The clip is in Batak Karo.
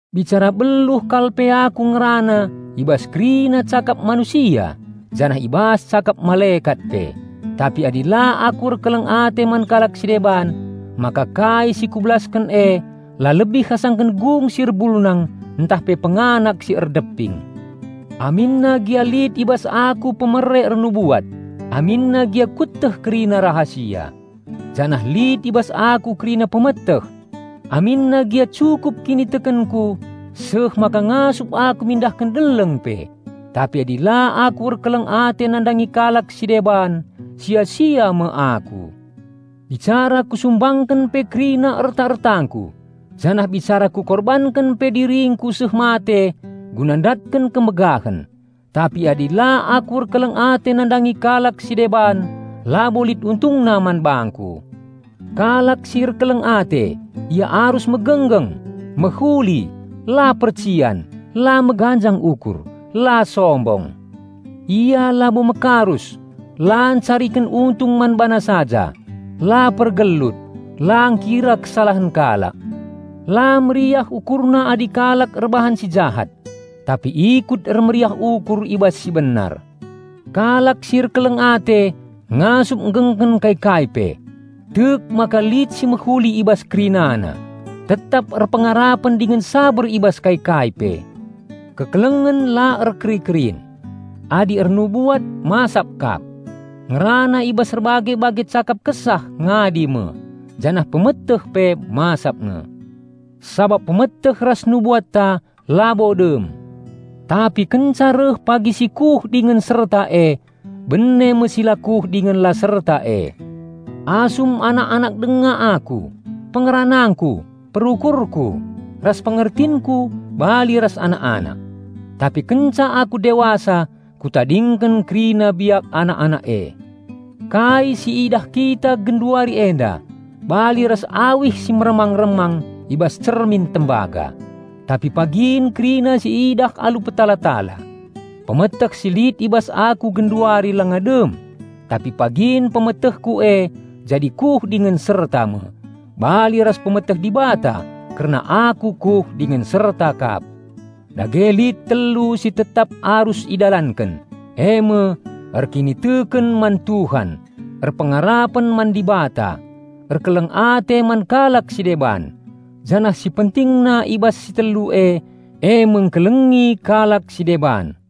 Bicara beluh kal pe aku ngerana i bas kerina cakap manusia janah i bas cakap malekat pe, tapi adi la aku erkeleng ate man kalak si deban, maka kai si kubelasken e la lebih asangken gung si erbulnang ntah pe penganak si erdeping. Aminna gia lit i bas aku pemere ernubuat, aminna gia kueteh kerina rahasia, janah lit i bas aku kerina pemeteh, aminna gia cukup kinitekenku seh maka ngasup aku mindahken deleng pe, tapi adi la aku erkeleng ate nandangi kalak si deban, sia-sia me aku. Bicara kusumbangken pe kerina erta-ertangku, janah bicara kukorbanken pe diringku seh mate guna ndatken kemegahen, tapi adi la aku erkeleng ate nandangi kalak si deban labo lit untungna man bangku. Kalak si erkeleng ate, ia arus megenggeng, mehuli, la percian, la meganjang ukur, la sombong. Ia labo mekarus, la ncariken untung man bana saja, la pergelut, la ngkira kesalahen kalak. La meriah ukurna adi kalak erbahan si jahat, tapi ikut ermeriah ukur i bas si benar. Kalak si erkeleng ate ngasup nggengken kai-kai pe, tek maka lit si mehuli i bas kerinana, tetap erpengarapen dingen saber i bas kai-kai pe. Kekelengen la erkeri-kerin. Adi ernubuat masap kap; ngerana i bas erbage-bage cakap Kesah ngadi me, janah pemeteh pe masap nge. Sabap pemeteh ras nubuatta labo dem. Tapi kenca reh pagi si kuh dingen serta e, bene me si la kuh dingen la serta e. Asum anak-anak denga aku, pengeranangku, perukurku, ras pengertinku bali ras anak-anak. Tapi kenca aku dewasa, kutadingken kerina biak anak-anak e. Kai siidah kita genduari enda bali ras awih si meremang-remang i bas cermin tembaga; tapi pagin kerina siidah alu petala-tala. Pemeteh si lit i bas aku genduari langa dem; tapi pagin pemetehku e jadi kuh dingen serta me, bali ras pemeteh Dibata kerna aku kuh dingen serta kap. Dage lit telu si tetap arus idalanken, eme: erkiniteken man Tuhan, erpengarapen man Dibata, erkeleng ate man kalak si deban, janah si pentingna i bas si telu e, eme engkelengi kalak si deban.